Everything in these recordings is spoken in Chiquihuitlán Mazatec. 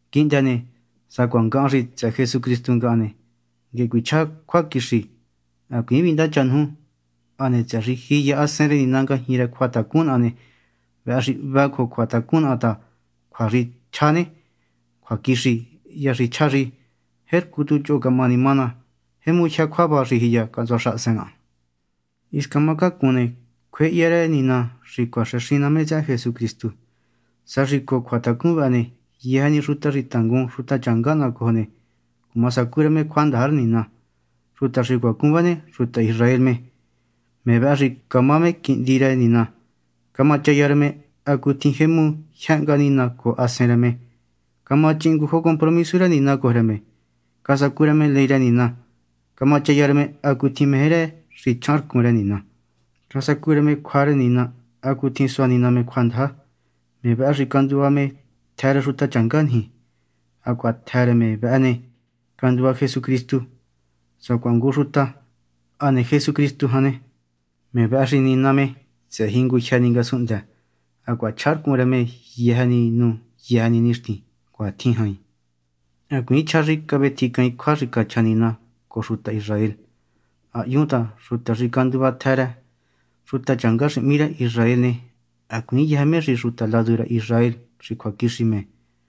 Quihndë ne, sacuaha ngahan xi tsëhë Jesucristu ngahan ne, nguehe cuichjá cjuaquixi, hacuiin vindácha nuju. Hane tsëhë xi jiya Hasen rë Nina ngajñi rë cjuatacun naha ne, vëhë xi hvë cojo cjuatacun naha ta cjua xi chjá ne, cjuaquixi hya xi chjá xi jercu tu choho camahani má ná, jemu jyë cjuava xi jiya cahntsua xahasen naha. Hisca má cácun ne, cjuéhya rë Nina xi cuaxëxin ná me tsëhë Jesucristu sa xi cojo cjuatacun vëhë ne, yëjë ni xuta xi tangun xutachanga naha cojo ne, cuma sacú rë me cjuandaja rë Nina. Xuta xi cuacun vë ne, xuta Israel me. Me vëhë xi camá me quihndi rë Nina, camachaya rë me hacutjin jemu jyë hnga Nina cojo Hasen rë me, camachihin ngu jo compromisu rë Nina cojo rë me, casacu rë me ley rë Nina, camachaya rë me hacutjin meje rë xi chjaharcun rë Nina, casacu rë me cjua rë Nina hacutjin sua Nina me cjuandaja. Me vëhë xi canduva me tjë rë xutachanga niji, hacuaha tjë rë me vëhë ne, canduva Jesucristu sacuaha ngu xuta. Hane Jesucristu jan ne, me vëhë xi Nina me tsëhë jingujyë ni ngasunhndë, hacuaha chjaharcun rë me yëjë nu yëjë nixtin. Cuatjin jain. Hacuiin chjá xi cavetjincaain cjua xi cachja Nina cojo xuta Israel. Ha hyun ta xuta xi canduva tjë rë xutachanga xi hmí rë Israel ne, hacuiin yëjë me xi xuta ladu rë Israel xi cjuaquixi me.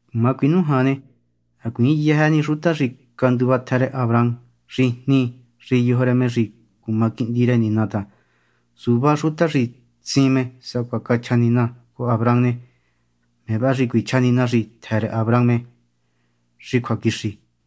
Cuma cuinújan ne, hacuiin yëjë ni xuta xi canduva tjë rë Abraham xi jni xi yojo rë me xi cuma quihndi rë Nina ta, suvá xuta xi tsin me sacuatjin cachja Nina cojo Abraham ne, me vëhë xi cuichja Nina xi tjë rë Abraham xi cjuaquixi.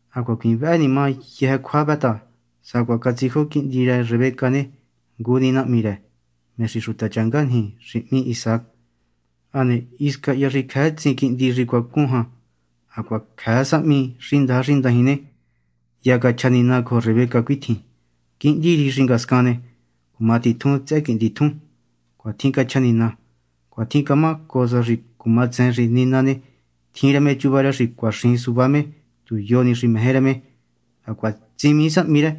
Hacuaha hacuiin vëhë ni má yëjë cjua vë ta sacuaha catsijo quihndi rë Rebeca ne, ngu ni nahmi rë, me xi xutachanga niji xi hmí Isaac. Hane hisca hya xi cjëë tsin quihndi xi cuacun jan, hacuaha cjëë sahmi xi ndaja xi ndajin ne, hya cachja Nina cojo Rebeca cuitjin: “Quihndi riji xi ngascan ne, cuma titjun tsëhë quihndi tjun.” Cuatjin cachja Nina. Cuatjin camá cojo sa xi cuma tsejen xi Nina ne, tjin rë me chuva rë xi cuaxijin suvá me tu yo ni xi meje rë me, hacuaha tsimii sahmi rë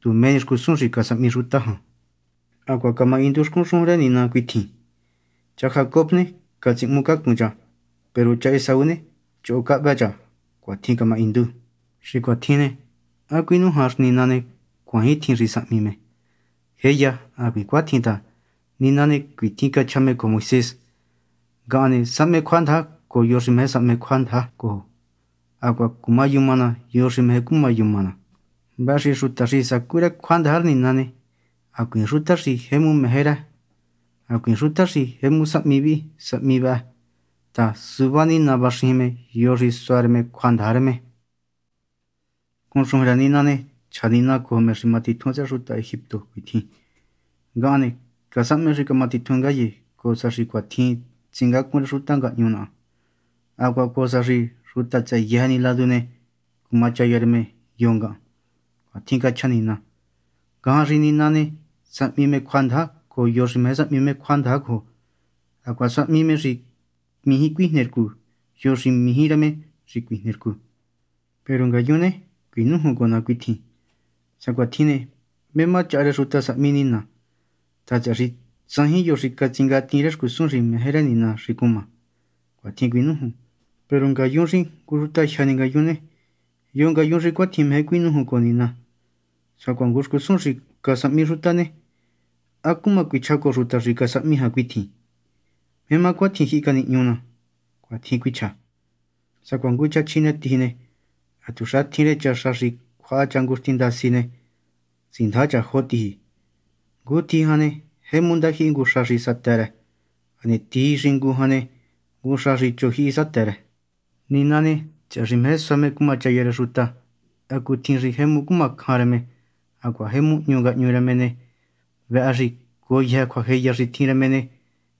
tu mé ni xcusun xi casahmi xuta jan. Hacuaha camahindu xcun xujun rë Nina cuitjin: “Cha Jacob ne, catsíhmucacun cha, peru cha Esaú ne, choho cahvë cha.” Cuatjin camahindu. Xi cuatjin ne, ¿há cuinújan xi Nina ne, cuaaintjin xi sahmi me? ¡Jéya, hacuiin! ta Nina ne cuitjin cachja me cojo Moisés: “Ngahan ne, sahme cjuandaja cojo yo xi meje sahme cjuandaja cojo, hacuaha cumayuma ná yo xi meje cuma yuma ná.” Vëhë xi xuta xi sacu rë cjuandaja rë Nina ne, hacuiin xuta xi jemu meje rë, hacuiin xuta xi jemu sahmi vihi sahmi vëhë ta suvá Nina vaxijin me yo xi sua me cjuandaja rë me. Xcun xujun rë Nina ne, chja Nina cojo me xi ma titjun tsëhë xuta Egipto cuitjin: “Ngahan ne, casahme xi camatitjun ngaye cojo sa xi cuatjin tsingácun rë xuta ngahñu naha, hacuaha cojo sa xi xuta tsëhë yëjë ni ladu ne, cumachaya rë me yo ngahan.” Cuatjin cachja Nina. Ngajan xi Nina ne, sahmi me cjuandaja cojo yo xi meje sahmi me cjuandaja cojo, hacuaha sahmi me xi mijí cuijne rcu yo xi meje rë me xi cuijnii rcu. Peru ngu ngayun ne, cuinújun cojo ná cuitjin: “Sa cuatjin ne, ¿mé má chaha rë xuta sahmi Nina? ta, tsëhë xi tsajin yo xi catsingatiin rë xcusun xi meje rë Nina xi cuma.” Cuatjin cuinújun. Peru ngayun xi ngu xutajyë ni ngayun ne, ¿yo ngayun xi cuatjin meje cuinújun cojo Nina? Sacuaha ngu xcusun xi casahmi xuta ne, ¿há cuichja cojo xuta xi casahmi jan cuitjin: “¿Mé má cuitjin jyihi canihñu ná?” Cuatjin cuichja. Sacuaha ngu cha chjinetiji ne, hatuxa tjin rë cha xa xi cjuaha cha ngu xtin ndasi ne, tsindaja cha jo tiji. Ngu tiji jan ne, jemu ndajyihi ngu xa xi satë rë, hane tiji xingu jan ne, ngu xa xi chojyihi satë rë. Nina ne, tsëhë xi meje sua me cumachaya rë xuta hacutjin xi jemu cuma cjan rë me hacuaha jemu hñu ngahñu rë me ne, vëhë xi cojo yëjë cjuajeya xi tjin rë me ne,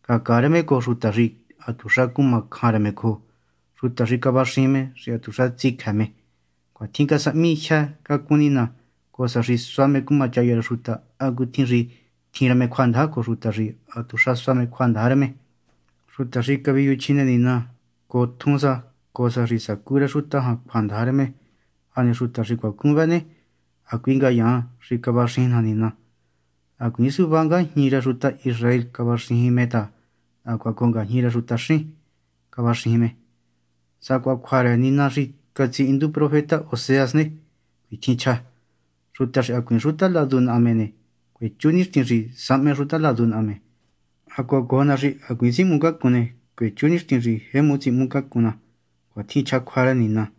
cacaa rë me cojo xuta xi hatuxa cuma cjan rë me cojo, xuta xi cavaxijin me xi hatuxa tsicjë me. Cuatjin casahmi jyë cacun Nina, cojo sa xi sua me cumachaya rë xuta hacutjin xi jemu tjin rë me cjuandaja cojo xuta xi hatuxa sua me cjuandaja rë me, xuta xi caviyuju chjine Nina cojo tjun sa, cojo sa xi sacú rë xuta jan cjuandaja rë me. Hane xuta xi cuacun vëhë ne, hacui ngayaan xi cavaxijin naja Nina. Hacuiin suvá ngajñi rë xuta Israel cavaxijin me ta hacuaha cojo ngajñi rë xutaxín cavaxijin me. Sacuaha cjua rë Nina xi catsihindu profeta Oseas ne, cuitjin chja: Xuta xi hacuiin xuta ladu naha me ne, cuechú nixtin xi sahme xuta ladu naha me; hacuaha cojo na xi hacuiin tsíhmucacun ne, cuechú nixtin xi jemu tsíhmucacun na. Cuatjin chja cjua rë Nina.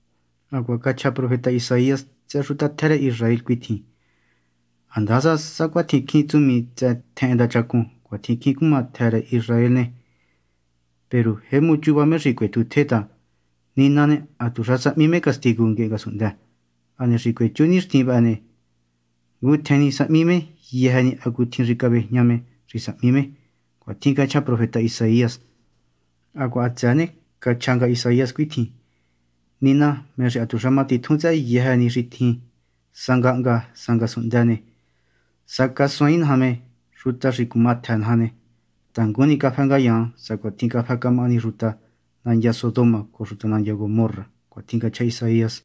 Hacuaha cachja profeta Isaías tsëhë xuta tjë rë Israel cuitjin: “Handasa sacuatjin cjín tsumi tsëhë ndachacun cuatjin cjín cuma xuta tjë rë Israel ne, peru jemu chuva me xi cuetjutje me ta, Nina ne, hatuxa sahmi me castigu nguehe ngasunhndë, hane xi cuechú nixtin vëhë ne, ngutjen ni sahmi me yëjë ni hacutjin xi cavejña me xi sahmi me.” Cuatjin cachja profeta Isaías. Hacuaha hatsëë ne, cachja nga Isaías cuitjin: Nina, me xi hatuxa matitjun tsëhë yëjë ni xi tjin, sa ngahnga sa ngasunhndë ne, sa xi casuaain naja me xuta xi cuma tjë naja ne, tangun ni cafë ngayaan sacuatjin cafë camahani xuta nandya Sodoma cojo xuta nandya Gomorra. Cuatjin cachja Isaías.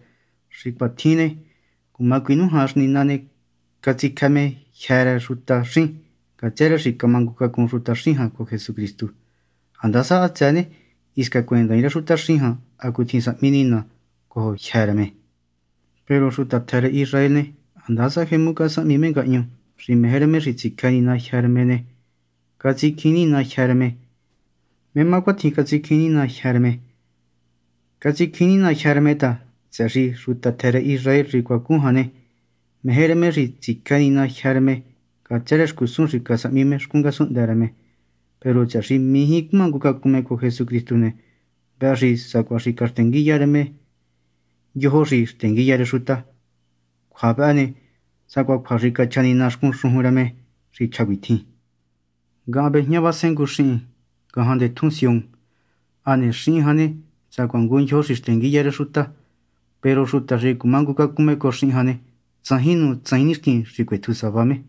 Xi cuatjin ne, cuma cuinújan xi Nina ne, catsicjë me jyë́ rë xutaxín ngatsë rë xi camangucacun xutaxín jan cojo Jesucristu, handasa hatsëë ne, hisca cuendaain rë xutaxín jan hacutjin sahmi Nina cojo jyë́ rë me. Peru xuta tjë rë Israel ne, handasa jemu casahmi me ngahñu xi meje rë me xi tsicjë Nina jyë́ rë me ne, peru catsicjiin Nina jyë́ rë me. ¿Mé má cuatjin catsicjiin Nina jyë́ rë me? Catsicjiin Nina jyë́ rë me ta, tsëhë xi xuta tjë rë Israel xi cuacun jan ne, meje rë me xi tsicjë Nina jyë́ rë me ngatsë rë xcusun xi casahmi me xcun ngasunhndë rë me. Peru tsëhë xi mijí cumangucacun me cojo Jesucristu ne, vëhë xi sacuaha xi caxtenguiya rë me “ndyojo xi xtenguiya rë xuta”. Cjua vëhë ne, sacuaha cjua xi cachja Nina xcun xujun rë me xi chja cuitjin: “Ngahan vejñávasen ngu xihin ngajan ndetjún Sión, hane xihin jan ne, sacuaha ngu ndyojo xi xtenguiya rë xuta; peru xuta xi cumangucacun cojo xihin jan ne, tsajin nu tsajin nixtin xi cuetju sava me.”